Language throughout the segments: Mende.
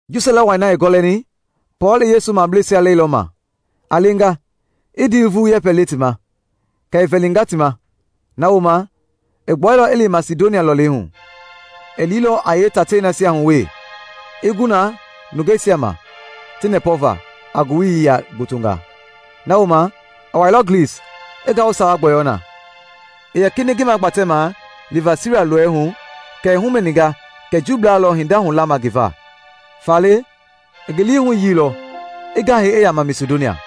Ji sɔlɛ wai na i gɔlɛni, Pɔɔl i Yesu mableisia lɛilɔ ma a lenga i ndii vulu yɛpɛnga le ti ma, kɛ i vɛlinga ti ma. Na wooma, i gbuɛilɔ i li Masidonia lɔlei hu. I liilɔ a yeetatei nasia hu wee i gu na nungeisia ma ti nɛpɔva a ngowili yia gbotongaa. Na wooma, i wailɔ Glis, i ngawu sawa gbɔyɔu na. I yɛ kinɛiŋ ngi magbatɛmaa liva Siira lɔɔɛi hu kɛ i humɛninga kɛ Juublaa lɔ hinda hula ma ngi va; faale i ngi lii huyiilɔ i gahɛi i yama Masidonia.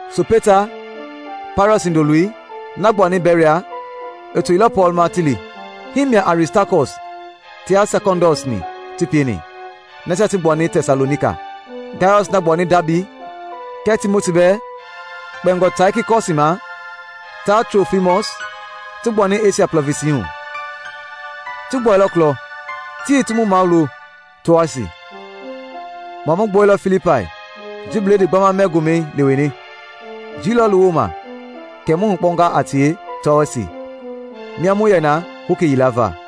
Sopeta, Pairɔs hindoloi, na gbuani Beria, i toilɔ Pɔɔl ma ti li. Hii mia Aristakɔs tia Sekɔndɔs-ni ti pieni, nasia ti gbuani Tɛsalonika; Gayɔs, na gbuani Daabi, kɛɛ Timoti bɛɛ; kpɛingɔ Taikikɔsi ma taa Trofimɔs, ti gbuani Esia plɔvinsi hu. Ti gbuɛilɔ kulɔ ti ti mu mawulo Toasi. Mua mu gbuɛilɔ Filipai ji bledii gbama mɛ gomɛi leweni, jii lɔɔlu woma kɛ mu hukpɔnga a tie Toasi, mia mu yɛ na hoki yila va.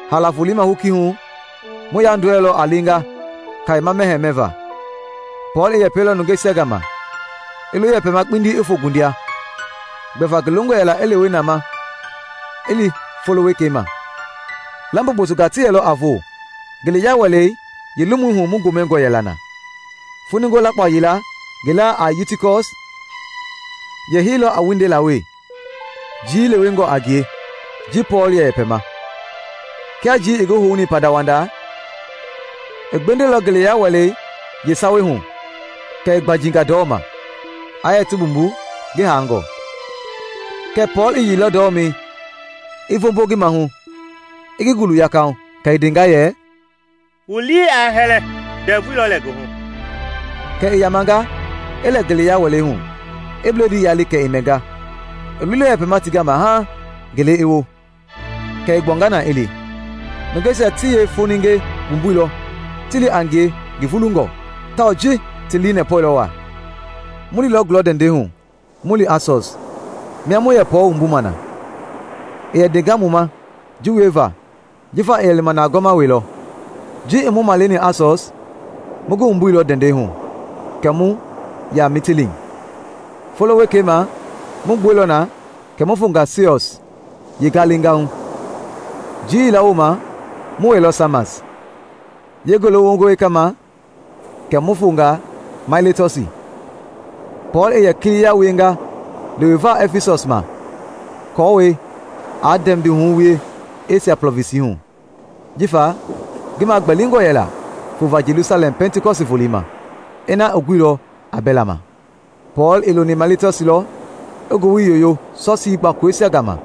Haala voloi ma hoki hu, mu yandɔɛilɔ a lenga kayema mɛhɛɛ mɛva. Pɔɔl i yɛpɛilɔ nungeisia gama, i lo yɛpɛma kpindi i fo gundia, gbɛva ngi longɔ yɛla i lewe na ma i li folo wekei ma. Lambo gbotongaa ti yɛlɔ a vo ngeleya wɛlei yeelomui hu mu gomɛngɔ yɛla na. Foninge lakpao yila ngi laa a Utikɔs yɛ heilɔ a wundela we jii i lewenga a ngie ji Pɔɔl yɛ yɛpɛma. Kia jii i ngi houni pandawanda, i gbendɛilɔ ngeleya wɛlei yeesawei hu kɛ i gbanjinga ndɔma, aa yɛ ti mbumbu, ngi haangɔ. Kɛɛ Pɔɔl i yeilɔ ndɔmɛi i vombo ngi maahu i ngi gulu yakahu, kɛ i ndenga yɛ, “Wu lii aa hɛlɛ, ndɛvui lɔ lɛ ngi hu!” Kɛ i yamanga i lɛ ngeleya wɛlei hu i bledii yali kɛ i mɛnga. I loilɔ yɛpɛma ti gama haaŋ gele i wo, kɛ i gbuanga na i li. Nungeisia ti yee foninge wumbuilɔ ti li a ngie ngi vulungɔ, tawao ji ti lii nɛpɔilɔ wa. Mu liilɔ gulɔ ndɛndɛi hu mu li Asɔs, mia mu yɛ Pɔɔl wumbuma na. I yɛ ndenga mu ma ji wieva jifa i yɛ lima na a gɔɔma welɔ. Ji i mu maleni Asɔs, mu ngi wumbuilɔ ndɛndɛi hu kɛ mu ya Mitileen. Folo wekei ma mu gbuɛilɔ na kɛ mu fonga Siɔs yalengahu. Jii yila woma mu wɛilɔ Samas, yee ngele wongɔ wekei ma kɛ mu fonga Mailetɔsi. Pɔɔl i yɛ kiliya wienga leweva Ɛfisɔs ma kɔwɔi aa ndɛmbihu wie Esia plɔvinsi hu, jifa ngi magbɛlingɔ yɛla fova Jelusalɛm Pɛntikɔsti volei ma, ina i guilɔ a bɛla ma. Pɔɔl i loni Mailetɔsi lɔ i ngowili yoyoo Sɔsii gbakoloisia gama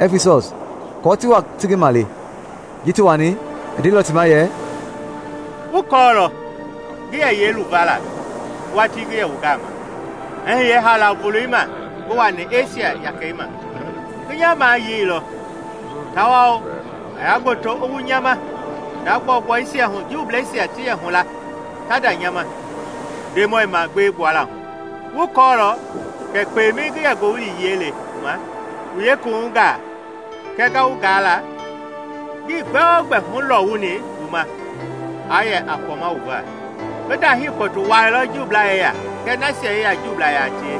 Ɛfisɔs kɔɔ ti wa ti ngi male. Ji ti wani, i ndeilɔ ti ma yɛ, “Wu kɔɔlɔ ngi yɛ yeeluvala watii ngi yɛ wu gama, i hiye haala voloi ma ngi wani Esia yakei ma. Ngi nya mayeilɔ tawao ngaya gboto i wu nya ma hinda gbɔugbɔisia hu Juubleisia ti yɛ hula ta nda nya ma Ndemɔi magbeei gbuala hu. Wu kɔɔlɔ kɛ kpemɛi ngi yɛ ngowili yie le wu ma wu yeekuwuhungaa kɛɛ nga wu gaala, ngii gbɛogbɛ hulɔwuni wu ma aa yɛ a kpɔma wu va. Ngi ndahii kpɔtu wuailɔ Juublaa yeya kɛɛ nasia yeya Juublaa yaa tie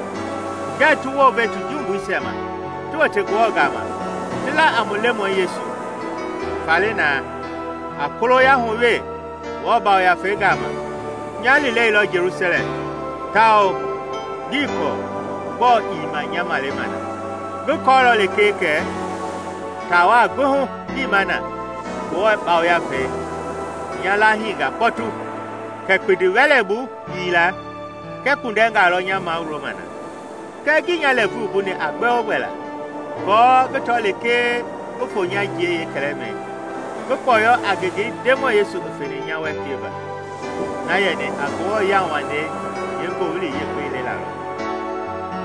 ngɛ ti wounve ti jumbuisia ma ti wote Ngewɔ gama ti la a mu Lemɔi Yesu. Faale na, a koloya hu wee Ngewɔ Yafei gama, nya liileilɔ Jelusalɛm, tao ngii kɔɔ gbɔɔ i ma nya malema na. Ngi kɔɔlɔ lekee kɛ taawa gbi hu ngi ma na Ngewɔ Yafei i nya lahiinga kpɔtu kɛ kpindiwɛleibu yiila kɛɛ kpundɛngaa lɔ nya mawulo ma. Kɛɛ ngii nya lɛɛvui wumbuni a gbɛ o gbɛ la, aako ngi tɔ lekee ngi fo nya jiei yeekɛlɛmɛi ngi kpɔyɔ a ngengei Ndemɔi Yesu i feni nya wɛ pieva, na yɛni a Ngewɔ yauwandei yee Ngowili Yekpe lelalɔ.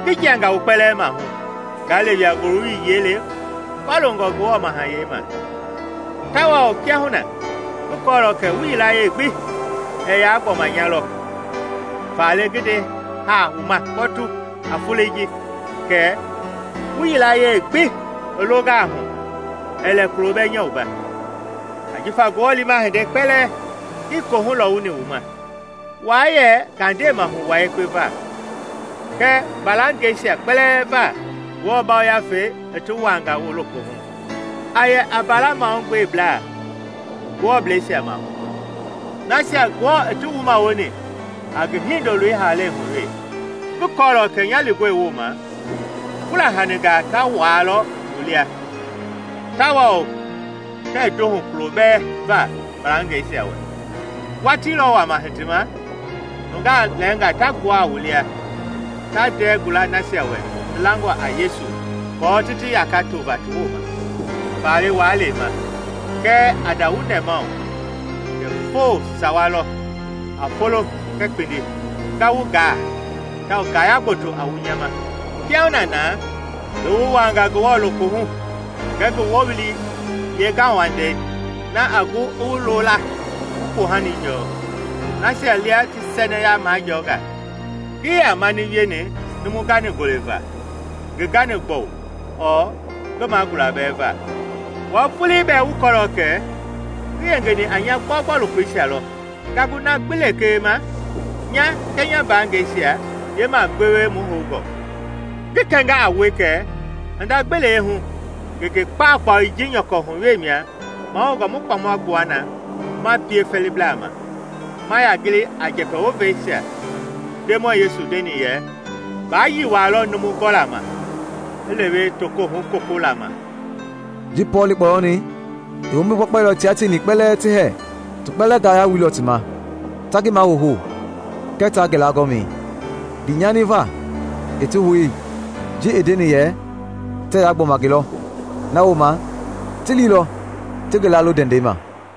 “Ngi jianga wu kpɛlɛɛ mahu, nga lewea ngoowili yie le kɔloongɔ Ngewɔ Mahayɛi ma. Tawao kiahuna ngi kɔɔlɔ kɛ wu yilayee gbi ɛɛ yaa gbɔma nya lɔ. Faale ngi nde haa wu ma kpɔtu a foloi ji kɛ, wu yilayee gbi i longaa hu, ɛɛ lɛ kulo bɛɛ nya wumba. Ajifa Ngewɔ liima hinde kpɛlɛɛ ngi koohu lɔwuni wu ma. Waa yɛ ngandeemahu wua yekpe va kɛɛ mbalangɛisia kpɛlɛɛ va Ngewɔ Yafei i ti wuaanga wu lokohu. A yɛ a mbaala mahugbeblaa Ngewɔbleisia maahu, nasia Ngewɔ ti wumawoni a ngi Hindoloi haalei hu wee. Ngi kɔɔlɔ kɛ nya lingɔi woma fula haningaa ta wuaalɔ wu lia, tawao tɛɛ ndohu kulo bɛɛ va mbalangɛisia wɛ. Watii lɔ hitima wama nungaa lɛnga ta gbuaa wu lia ta ndɛɛ gula nasia wɛ ti langɔ a Yesu aako ti ti yaka tova ti woma. Faale waa lema, kɛɛ a nda wu nɛmahu kɛ foo sawa lɔ, a folo kɛɛ kpindi, nga wu gaa tao ngaya gboto a wu nya ma. “Kiahuna na, ngi wu wuaanga Ngewɔ lokohu kɛɛ ngi woowili yeengauwandei, na a gu i wu loo la wu poohani jɔɔ nasia lia ti sɛnɛya majɔnga. Ngii yaa mani wieni numu gani-gole va, ngi gani-gbɔu ɔɔ ngi magula bɛɛ va. Wua vuuli bɛɛ wu kɔɔlɔ kɛ ngi yengeni a nya gbɔgbɔ lokoisia lɔ nga gu na gbi lee ma nya kɛɛ nya mbaangɛisia yeemagbewe mu houngɔ. Ngi kɛnga a wue kɛ hinda gbi lee hu ngenge kpaukpau ji nyɔkɔ hu wee mia mahoungɔ mu kpɔma gbuana ma pie fɛliblaa ma, ma ya gili a njɛpɛ woisia Ndemɔi Yesu Ndeni, yɛ, ‘baayi waa lɔ numu gɔla ma i lewe tokohu gokola ma.’” Ji Pɔɔl i kpɔyɔni, i wombi gbakpailɔ tia tieni kpɛlɛɛ ti hɛɛ. Ti kpɛlɛɛ ngaya wuilɔ ti ma ta ngi mahouhou kɛɛ ta ngi laagɔmi, ndii nyani va i ti hou ji i ndeni yɛ tɛɛ yaa gbɔma ngi lɔ. Na wooma, ti liilɔ ti ngi laalo ndɛndɛi ma.